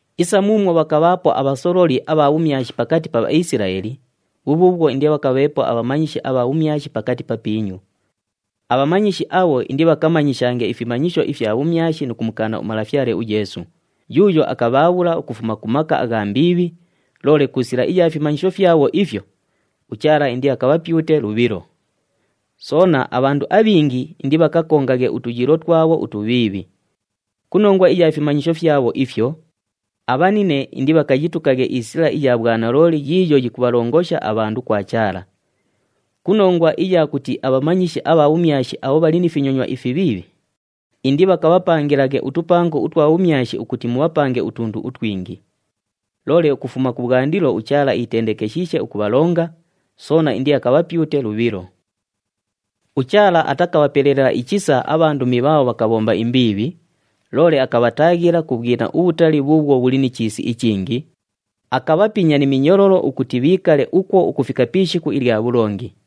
Isa muumwo bhakabhaapo abhasololi abha bhumyashi pakati pa Bhaisilaeli, bhubhuubhwo indibhakabheepo abhamanyishi abha bhumyashi pakati papiinyu. Abhamanyishi abho indibhakamanyishange ifimanyisho ifya bhumyashi nu kumukaana uMalafyale uYeesu, yuuyo akabhaabhula ukufuma ku maka agha mbiibhi, loole ku sila iya fimanyisho fyabho ifyo, uChaala indiakabhapyute lubhilo. Soona, abhandu abhingi indibhakakongaghe utuyiilo twabho utubhiibhi. Ku nongwa iya fimanyisho fyabho ifyo, abhanine indibhakayitukaghe isila iya bhwanalooli yiiyo yikubhalongosha abhandu kwa Chaala. Ku nongwa iya kuti abhamanyishi abha bhumyashi abho bhali ni finyonywa ifibhiibhi, indibhakabhapangilaghe utupango utwa bhumyashi ukuti mubhapange utundu utwingi. Loole ukufuma kubhwandilo uChaala iitendekeshiishe ukubhalonga, soona indiakabhapyute lubhilo. UChaala atakabhapelela ichisa abhandumi bhaabho bhakabhomba imbiibhi, loole akabhataaghila ku bhwina ubhutali bhuubhwo bhuli ni chiisi ichingi, akabhapinya ni minyololo ukuti bhiikale ukwo ukufika pi ishiku ilya bhulongi.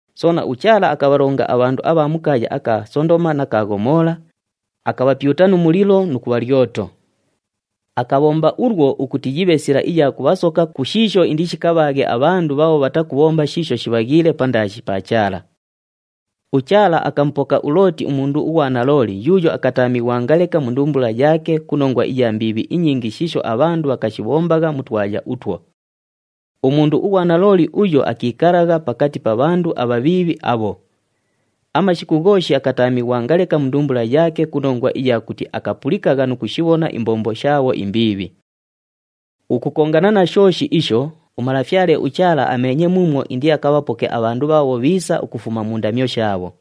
Soona, uChaala akabhalonga abhandu abha mu kaaya aka Sondoma na ka Ghomoola, akabhapyuta nu mulilo nu kubha lyoto. Akabhomba ulwo ukuti yibhe sila iya kubhasoka ku shiisho indishikabhaaghe abhandu bhaabho bhatakubhomba shiisho shibhaghiile pandaashi pa Chaala. UChaala akamupoka uLooti umundu ughwanalooli yuuyo akataamighwanga leka mu ndumbula yaake ku nongwa iya mbiibhi inyingi shiisho abhandu bhakashibhombagha mu twaya utwo. Umundu ughwanalooli uyo akiikalagha pakati pa bhandu abhabhiibhi abho. Amashiku ghooshi akataamighwanga leka mu ndumbula yaake ku nongwa iya kuti akapulikagha nu kushibhona imbombo shaabho imbiibhi. Ukukongana na shooshi isho, uMalafyale uChaala ameenye muumwo indiakabhapoke abhandu bhaabho bhiisa ukufuma mu ndamyo shaabho.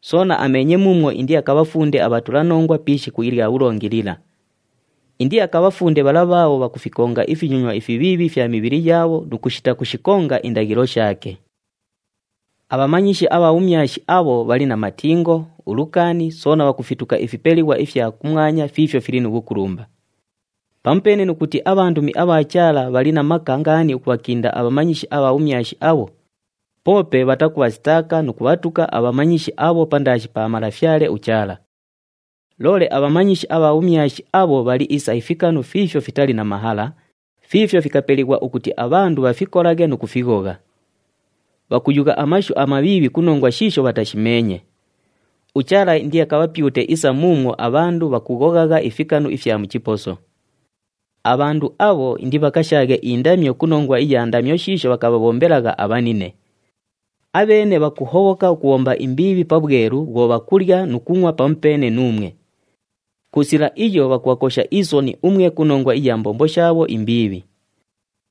Soona ameenye muumwo indiakabhafunde abhatulanongwa pi ishiku ilya bhulongi lila. Indiakabhafunde bhala bhaabho bhakufikonga ifinyonywa ifibhiibhi ifya mibhili yaabho nu kushita kushikonga indaghilo shaake. Abhamanyishi abha bhumyashi abho bhali na matingo, ulukaani, soona bhakufituka ifipelighwa ifya kumwanya fiifyo fili nu bhukulumba. Pamupeene nu kuti abhandumi abha Chaala bhali na maka ngaani ukubhakinda abhamanyishi abha bhumyashi abho, poope bhatakubhasitaaka nu kubhatuka abhamanyishi abho pandaashi pa Malafyale uChaala. Loole abhamanyishi abha bhumyashi abho bhali isa ifikanu fiifyo fitali na mahala, fiifyo fikapelighwa ukuti abhandu bhafikolaghe nu kufighogha. Bhakuyugha amashu amabhiibhi ku nongwa shiisho bhatashimeenye. UChaala indiakabhapyute isa muumwo abhandu bhakughoghagha ifikanu ifya mu chiposo. Abhandu abho indibhakashaaghe indamyo ku nongwa iya ndamyo shiisho bhakabhabhombelagha abhanine. Abheene bhakuhobhoka ukubhomba imbiibhi pabhwelu bhwo bhakulya nu kungʼwa pamupeene nuumwe. Ku sila iyo bhakubhakosha isoni umwe ku nongwa iya mbombo shaabho imbiibhi.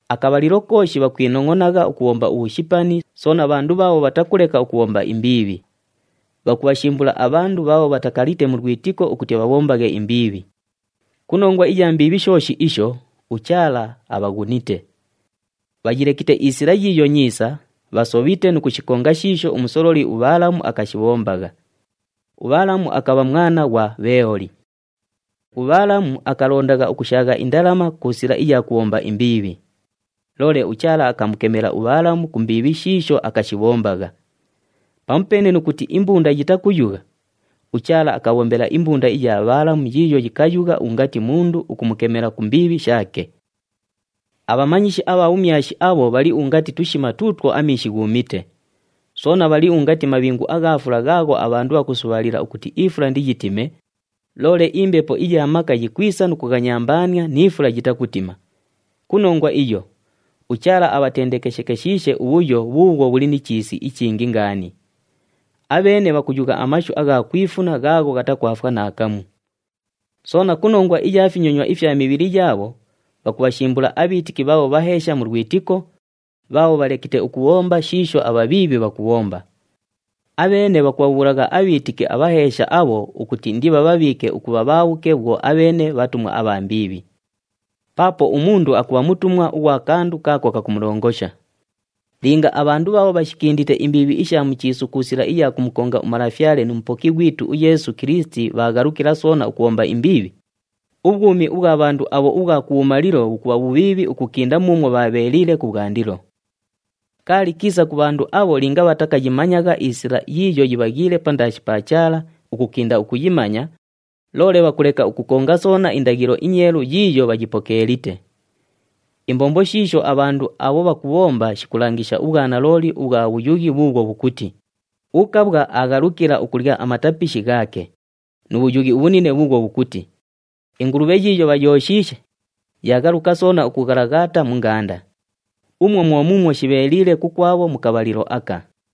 Akabhalilo kooshi bhakwinongʼonagha ukubhomba ubhushipani, soona bhandu bhaabho bhatakuleka ukubhomba imbiibhi. Bhakubhashimbula abhandu bhaabho bhatakalite mu lwitiko ukuti bhabhombaghe imbiibhi. Ku nongwa iya mbiibhi shooshi isho, uChaala abhaghunite. Bhayilekite isila yiiyo nyiisa, bhasobhite nu kushikonga shiisho umusololi uBhaalamu akashibhombagha. UBhaalamu akabha mwana ghwa Bheeoli. UBhaalamu akalondagha ukushaagha indalama ku sila iya kubhomba imbiibhi. Loole uChaala akamukemela uBhaalamu ku mbiibhi shiisho akashibhombagha. Pamupeene nu kuti imbunda yitakuyugha, uChaala akabhombela imbunda iya Bhaalamu yiiyo yikayugha ungati mundu ukumukemela ku mbiibhi shaake. Abhamanyishi abha bhumyashi abho bhali ungati tushima tuutwo amiishi ghuumite. Soona bhali ungati mabhingu agha fula ghaagho abhandu bhakusubhaalila ukuti ifula indiyitime, loole imbepo iya maka yikwisa nu kughanyambaania ni fula yitakutima. Ku nongwa iyo, uChaala abhatendekeshekeshiishe ubhuyo bhuubhwo bhuli ni chiisi ichingi ngaani. Abheene bhakuyugha amashu agha kwifuna ghaagho ghatakwafwa naakamu. Soona ku nongwa iya finyonywa ifya mibhili yaabho, bhakubhashimbula abhiitiki bhaabho bhaheesha mu lwitiko, bhaabho bhalekite ukubhomba shiisho abhabhiibhi bhakubhomba. Abheene bhakubhabhuulagha abhiitiki abhaheesha abho ukuti indibhabhabhiike ukubha bhaabhuke bhwo abheene bhatumwa abha mbiibhi. Paapo umundu akubha mutumwa ughwa kandu kaako kakumulongosha. Linga abhandu bhaabho bhashikindite imbiibhi isha mu chiisu ku sila iya kumukonga uMalafyale nu Mupoki ghwitu uYeesu Kilisiti bhaaghalukila soona ukubhomba imbiibhi, ubhwumi ubhwa bhandu abho ubhwa kubhumalilo bhukubha bhubhiibhi ukukinda muumwo bhwabheeliile kubhwandilo. Kaali kiisa ku bhandu abho linga bhatakayimanyagha isila yiiyo yibhaghiile pandaashi pa Chaala ukukinda ukuyimanya, loole bhakuleka ukukonga soona indaghilo inyeelu yiiyo bhayipokeelite. Imbombo shiisho abhandu abho bhakubhomba shikulangisha ubhwanalooli ubhwa bhuyughi bhuubhwo bhukuti, “Ukabhwa aaghalukila ukulya amatapishi ghaake,” nu bhuyughi ubhunine bhukuti, “Ingulubhe yiiyo bhayooshiishe, yaaghaluka soona ukughalaghaata mu ngaanda.” Umwo mwo muumwo shibheeliile kukwabho mu kabhalilo aka.